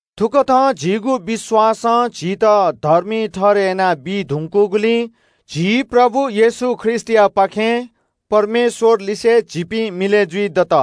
थुकथं झीगु विश्‍वासं झीत धर्मी ठहरय् यानाबी धुंकूगुलिं झी प्रभु येशू ख्रीष्‍टयापाखें परमेश्‍वरलिसे झीपिं मिलय् जुइदत।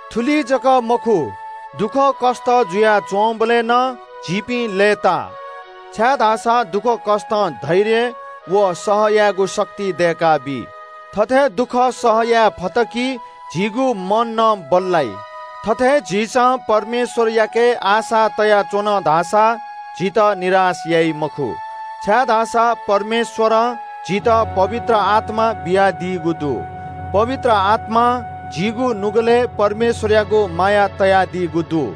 थुलि जक मखु, दुःखकष्‍ट जुयाच्‍वंबलय् नं झीपिं लय्‌ताः, छाय्‌धाःसा दुःखकष्‍टं धैर्य व सह यायेगु शक्ति दय्‌काबी। थथे दुःख सह यायेफत धाःसा झीगु मन नं बल्‍लाइ। थथे झीसं परमेश्‍वरयाके आशा तयाच्‍वन धाःसा झीत निराश याइ मखु, छाय्‌धाःसा परमेश्‍वरं झीत पवित्र आत्‍मा बियादीगु दु। पवित्र आत्‍मां झीगु नुगलय् परमेश्‍वरयागु माया तयादीगु दु।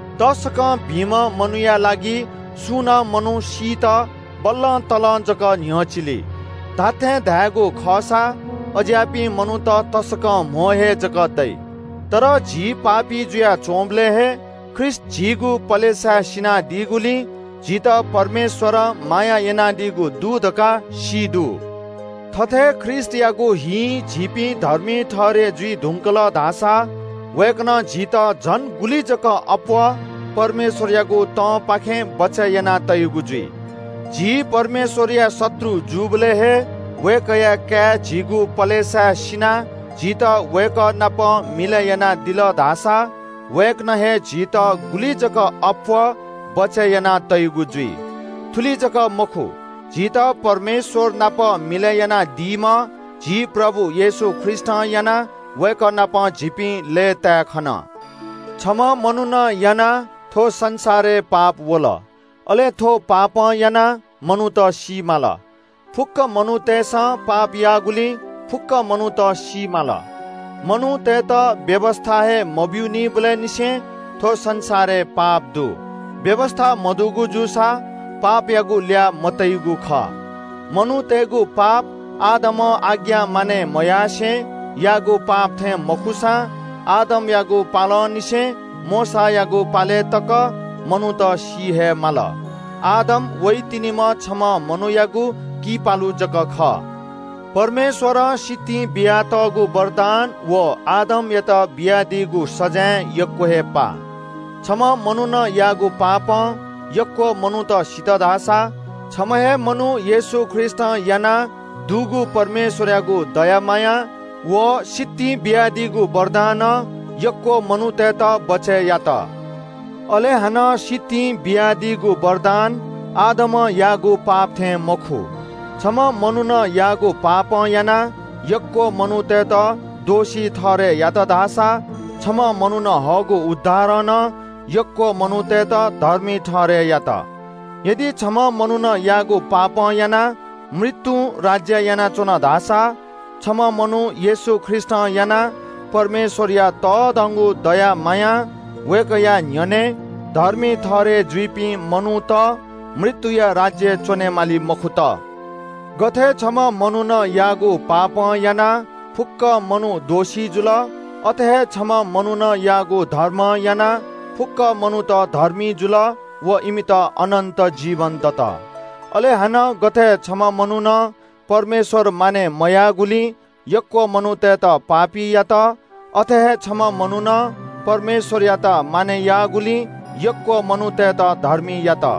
तसकं भिंम्‍ह मनूया लागि सुं नं मनू सीत बल्‍लतल्‍लं जक न्‍ह्यचिली। धात्‍थें धायेगु खःसा अज्‍याःपिं मनूत तसकं कम हे जक दइ। तर झी पापी जुयाच्‍वंबलय् हे ख्रीष्‍ट झीगु पलेसाय् सिनादीगुलिं झीत परमेश्‍वरं माया यानादीगु दु धकाः सी दु। थथे ख्रीष्‍टयागु हिं झीपिं धर्मी ठहरय् जुइ धुंकल धाःसा वय्‌कलं झीत झन गुलि जक अप्‍वः परमेश्‍वरयागु तंपाखें बचय् याना तइगु जुइ। झीपिं परमेश्‍वरया शत्रु जूबलय् हे वय्‌कःया काय् झीगु पलेसाय् सिनाः झीत वय्‌कः नाप मिलय् यानादिल धाःसा वय्‌कलं हे झीत गुलि जक अप्‍वः बचय् याना तइगु जुइ। थुलि जक मखु, झीत परमेश्‍वर नाप मिलय् यानादीम्‍ह झी प्रभु येशू ख्रीष्‍टं यानाः वय्‌कः नाप झीपिं लय्‌ताय् खन। छम्‍ह मनुखं यानाः थ्‍व संसारय् पाप वल। अले थ्‍व पापं यानाः मनूत सी माल। फुक्‍क मनूतय्‌सं पाप याःगुलिं फुक्‍क मनूत सी माल। मनूतय्‌त व्‍यवस्‍था हे मब्‍यूनिबलय् निसें थ्‍व संसारय् पाप दु। व्‍यवस्‍था मदुगु जूसा पापयागु ल्‍याः मतइगु खः। मनूतय्‌गु पाप आदमं आज्ञा मानय् मयासें याःगु पाप थें मखुसां आदमयागु पालंनिसें मोशायागु पालय् तक मनूत सी हे माल। आदम वइतिनिम्‍ह छम्‍ह मनू थें च्‍वंम्‍ह जक खः। परमेश्‍वरं सितिं बियातःगु वरदान व आदमयात बियादीगु सजाँय यक्‍व हे पाः। छम्‍ह मनुखं याःगु पापं यक्‍व मनूत सित धाःसा छम्‍ह हे मनू येशू ख्रीष्‍टं यानाः दुगु परमेश्‍वरयागु दया माया व सितिं बियादीगु वरदानं यक्‍व मनूतय्‌त बचय् यात। अले हानं सितिं बियादीगु वरदान आदमं याःगु पाप थें मखु। छम्‍ह मनुखं याःगु पापं यानाः यक्‍व मनूतय्‌त दोषी ठहरय् यात धाःसा छम्‍ह मनुखं हःगु उद्धारं नं यक्‍व मनूतय्‌त धर्मी ठहरय् यात। यदि छम्‍ह मनुखं याःगु पापं यानाः मृत्‍युं राज्‍य यानाच्‍वन धाःसा छम्‍ह मनू येशू ख्रीष्‍टं यानाः परमेश्‍वरया तःधंगु दया मायां वय्‌कःया न्‍ह्यःने धर्मी ठहरय् जुइपिं मनूत मृत्‍युया राज्‍यय् च्‍वनेमाली मखुत। गथे छम्‍ह मनुखं याःगु पापं यानाः फुक्‍क मनू दोषी जुल, अथे हे छम्‍ह मनुखं याःगु धार्मिकताया ज्‍यां यानाः फुक्‍क मनूत धर्मी जुल व इमित अनन्‍त जीवन दत। अले हानं गथे छम्‍ह मनुखं परमेश्‍वर मानय् मयाःगुलिं यक्‍व मनूतय्‌त पापी यात, अथे हे छम्‍ह मनुखं परमेश्‍वरयात मानय् याःगुलिं यक्‍व मनूतय्‌त धर्मी यात।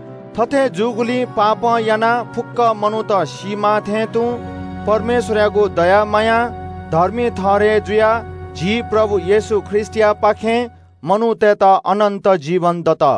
थथे जूगुलिं पापं यानाः फुक्‍क मनूत सीमाः थें तुं परमेश्‍वरयागु दया मायां धर्मी ठहरय् जुयाः झी प्रभु येशू ख्रीष्‍टयापाखें मनूतय्‌त अनन्‍त जीवन दत।